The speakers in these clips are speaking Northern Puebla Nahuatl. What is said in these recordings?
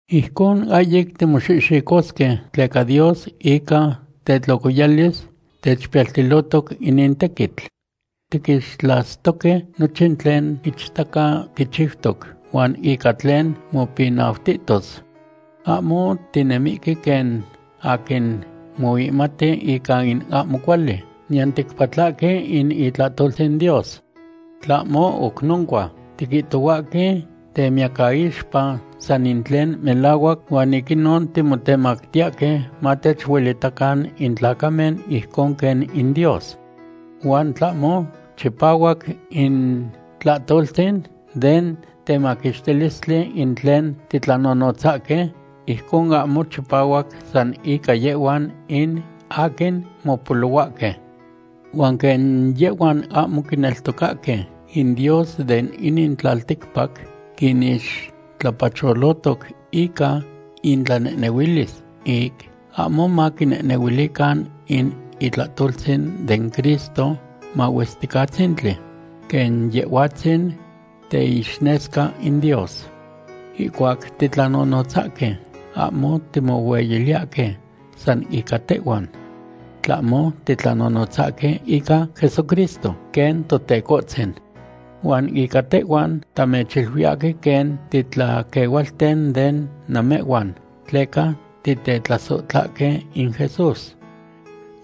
Ijcon ahyic timoxihxicosque, tleca Dios ica tetlocoyalis techpiyaltilotoc inin tequitl. Tiquixtlastoque nochin tlen ichtaca quichiutos huan ica tlen mopinautos. Ahmo tinemihque quen aquin moihmati ica in ahmo cuali, niyan ticpatlahque in itlahtoltzin Dios. Tlahmo oc noncua, tiquihtohuahque temiyacaixpa san in tlen melahuac huan ic inon timotemactiyahque matechuelitacan in tlacamen ijcon quen in Dios. Huan tlahmo chipahuac in tlahtoltzin den temaquixtilistli in tlen titlanonotzahque, ijcon ahmo chipahuac san ica yehhuan in aquin mopolohuahque. Huan quen yehhuan ahmo quineltocahque, in dios de inin tlalticpac quinixtlapacholotoc ica intlanehnehuilis ic ahmo maquinehnehuilican in itlahtoltzin den Cristo Mahuesticatzintli, quen Yehhuatzin teixnesca in Dios. Ihcuac titlanonotzahque, ahmo timohueyiliyahque san ica tehhuan, tlahmo titlanonotzahque ica Jesucristo quen Totecohtzin. Huan ica tehhuan, tamechiluiyahque quen titlaquehualten de namehhuan tleca titetlasohtlahque in Jesús.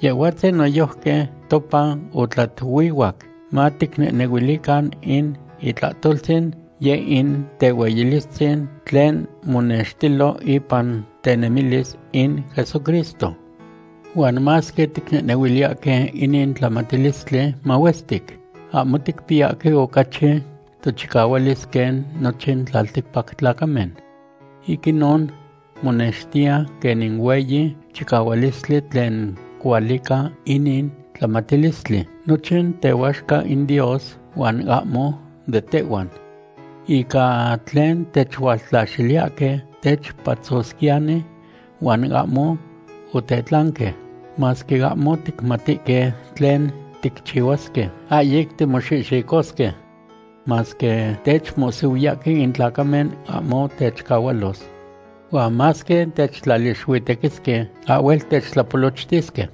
Yehhuatzin noyojqui topa otlatuihuac maticnehnehuilican in itlahtoltzin, yeh in tehueyilistzin tlen monextilo ipan tenemilis in Jesucristo. Huan masque ticnehnehuiliyahque inin tlamatilistli mahuestic, ahmo ticpiyahque ocachi tochicahualis quen nochin tlalticpac tlacamen. Ic inon monextiya quen in hueyi chicahualistli tlen cualica inin tlamatilistli, nochin tehuaxca in Dios huan ahmo de tehhuan. Ica tlen techualtlaxiliyahque, techpatzosquiyani huan ahmo otechtlanque; masque ahmo ticmatihque tlen ticchihuasque, ahyic timoxihxicosque. Masque techmohsihuiyahque in tlacamen, ahmo techcahualos. Huan masque techtlalixuitequisque, ahhuel techtlapolochtisque.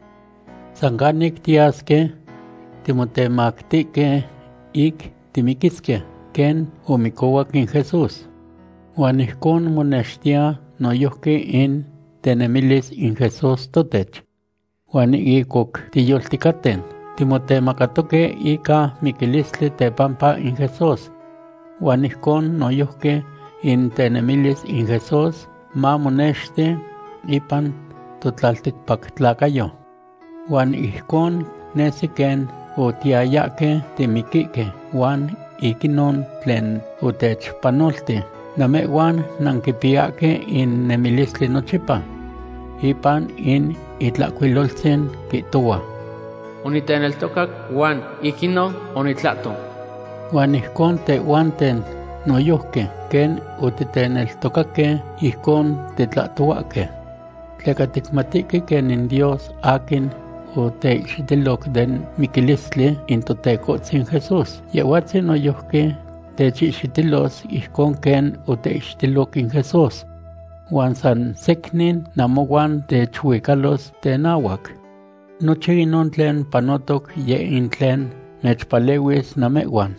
San canic tiyasque, timotemactihque ic timiquisque quen omicohuac in Jesús. Huan ijcon monextiya noyojqui in tenemilis in Jesús totech. Huan ic oc tiyolticaten, timotemacatoque ica miquilistli tepampa in Jesús. Huan ijcon noyojqui in tenemilis in Jesús mamonexti ipan totlalticpactlacayo. Huan ijcon nesi quen otiyayahque timiquihque huan ic inon tlen otechpanolti, namehhuan nanquipiyahque in nemilistli nochipa. Ipan in Itlahcuiloltzin quihtohua: “Oniteneltocac huan ic inon onitlahto.” Huan ijcon tehhuanten noyojqui, quen otiteneltocaque, ijcon titlahtohuahque. Tleca ticmatihque quen in Dios aquin oteihxitiloc den miquilistli in Totecohtzin Jesús, Yehhuatzin noyojqui techihxitilos ijcon quen oteihxitilo in Jesús. Huan san secnin namohuan techuicalos tenahuac. Nochin inon tlen panotoc yeh in tlen mechpalehuis namehhuan.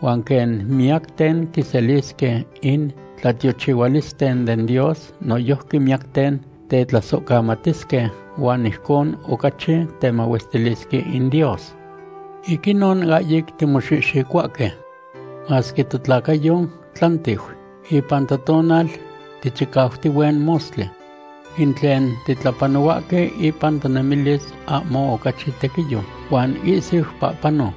Huan quen miyacten quiselisque in tlatiochihualisten den Dios, noyojqui miyacten tetlasohcamatisque huan ijcon ocachi temahuestilisque in Dios. Ic inon ahyic timoxihxicohuahque. Masque totlacayo tlantiu, ipan totonal tichicautihue mostli. In tlen titlapanohuahque ipan tonemilis ahmo ocachi tequiyo, huan ihsiu pahpano.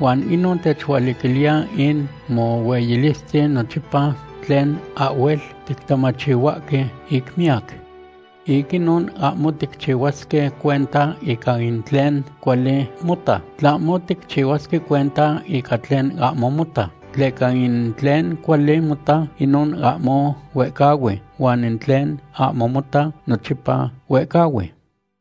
Huan inon techualiquiliya in mohueyilistzin nochipa tlen ahhuel tictamachihuahque ic miyac. Ic inon ahmo ticchihuasque cuenta ica in tlen cuali mota, tlahmo ticchihuasque cuenta ica tlen ahmo mota, tleca in tlen cuali mota, inon ahmo huehcahui, huan in tlen ahmo mota nochipa huehcahui.